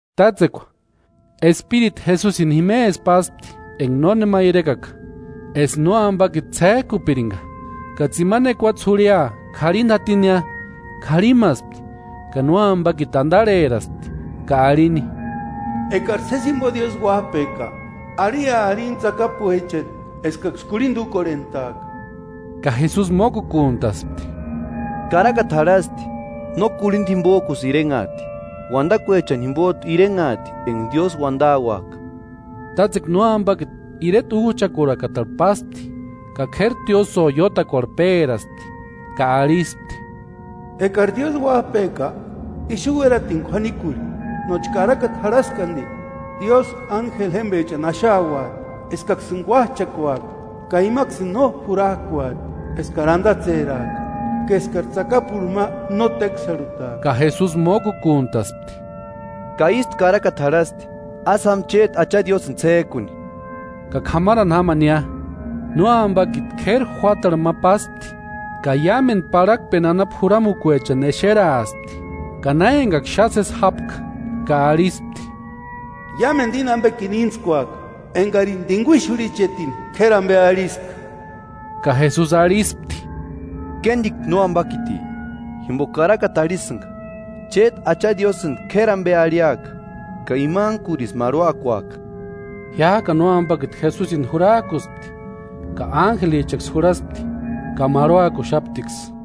Tátsekua Espiritu Jesusini jimesï páspti enka nónema irekaka, eska nóampakiti ts'ék'upirinka. Ka tsimani ekuatse jurhia k'arhinta jatinia, k'arhimaspti. Ka nóampakiti antarheraspti ka arhini: –Ekari sési jimpo Diósï uáp'eka arhia arini tsakapuechani eskaksï kurhinta úkorhent'aaka. Ka Jesusi mókukuntaspti: –Karakata jarhasti: “No k'urhinta jimpok'usï irenhaati, uantakuechani jimpot'u irenhaati enka Diósï uantauak'a.” Tátsekua nóampakiti ireta úch'akurakatarhu páspti ka k'éri tiósïo iótakuarhu péraspti ka arhispti: –Ekari Diósï Uáp'eka, ixu uératini k'uanikurhi, nóchka karakata jarhaski anti: Diósï ánjeli jémpechani axauati eskaksïni kuách'akuaka. Ka imaksïni no jurak'uati eskari antatseraaka, ka eskari tsakapurhu ma no téksarhutaaka. Ka Jesusi mókukuntaspti: Ka ístu karakata jarhasti: “Ásï jáma chéti Acha Diósïni ts'ék'uni.” Ka k'amarani jámania, nóampakiti k'éri juátarhu ma páspti ka iámentu parhakpeni anapu juramukuechani exeraaspti ka na enkaksï xáni sési jápka, ka arhispti: –Iámentu íni ampekini íntskuaka, enkarini t'inkuixurhichetini k'éri ampe arhiska. Ka Jesusi arhispti: –Kéntiku nóampakiti, jimpoka karakata arhisïnka: “Chéti Acha Diósïnti k'éri ampe arhiaka ka imantkurisï marhuakuaka.” Jiák'ani nóampakiti Jesusini jurak'uspti ka ánjelichaksï jurhaspti ka marhuakuxaptiksï.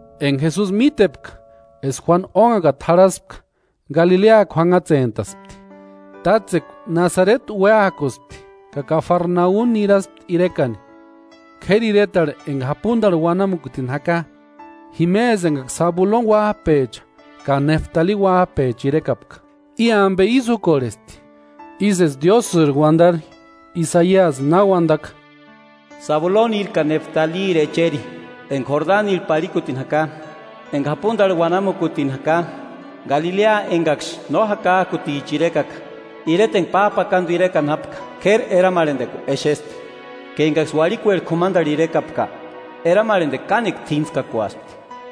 Enka Jesusi mítepka eska Juánu ónhakata jarhaspka, Galilea kuanhatsentaspti. Tátsekua Nasareti uéakuspti ka Kafarnaumi niraspti irekani, k'éri iretarhu enka japuntarhu uanamukutini jaka, jimesï enkaksï Sabuloni uáp'echa ka Néftali uáp'echa irekapka. I ampe ísï úkorhesti, ísï eska Diósïri uantari Isaiasi uantaka: “Sabuloniri ka Néftaliri echeri, enka Jordanirhu parhikutini jaka, enka japuntarhu uanamukutini jaka, Galilea enkaksï no jakak'uticha irekaka. Ireta enka páp'akantu irekani jápka k'éri eramarhantekua exesti, ka enkaksï uarhikueri k'umantarhu irekapka, eramarhantekua kánekua t'íntskakuaspti.”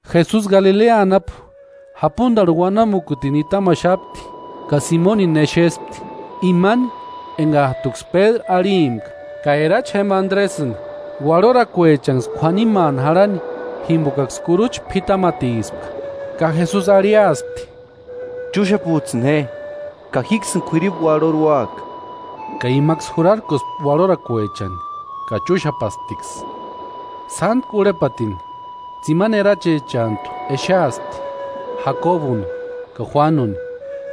Jesusi Galilea anapu japuntarhu uanamukuni nitamaxapti ka Simonini exespti, imani enkat'uksï Pédru arhimpka ka erachi jémpa Andresïni, uarhorakuechanksï k'uanimaani jarhani jimpokaksï kurucha p'itamatispka. Ka Jesusi arhiaspti: –Chúxaputs'ïni je, ka jíksïni k'uiripu uarhori úaka. Ka imaksï jurarkuaspti uarhorakuechani ka chúxapasptiksï. Sántku urhepatini tsimani erachichantu exeaspti, Jakobuni ka Juánuni,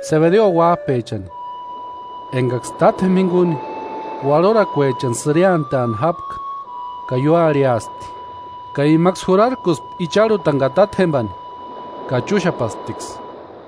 Sebedeo uáp'echani enkaksï tátjempa jinkuni uarhorakuechani sïriantani jápka, ka ióarhiaspti. Ka imaksï jurarkuspti icharhutani ka tátjempani ka chúxapasptiksï.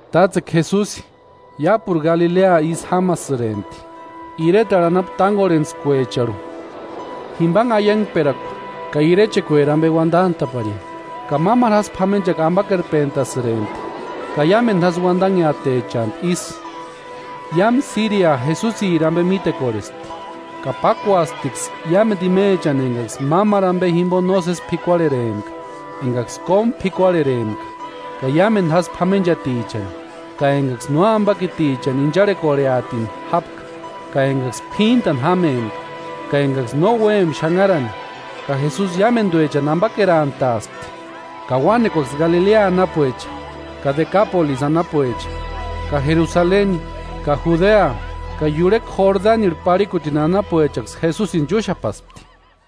Tátsekua Jesusi iápuru Galilea ísï jámasïrempti, iretarhu anapu tánkorhentskuecharhu, jimpanhe aiankperakua ka irechekueri ampe uantant'a'parini, ka mámaru jásï p'amenchakua ampakerpentasïrempti ka iámentu jásï uantanheatechantu ísï. Iámu Síria Jesusiri ampe mítekorhespti ka pákuasptiksï iámentu imechani enkaksï mámaru ampe jimpo nósesi p'ikuarherempka: Enkaksï kómu p'ikuarherempka ka iámentu jásï p'amenchatichani, ka enkaksï nóampakitichani incharhekorheatini jápka, ka enkaksï p'íntani jámempka ka enkaksï no úempka xanharani ka Jesusi iámentuechani ampakerantaaspti. Ka uánekuaksï Galilea anapuecha ka Dekapolisi anapuecha ka Jerusaleni ka Judea ka iurhekua Jordanirhu parhikutini anapuechaksï Jesusini chúxapaspti.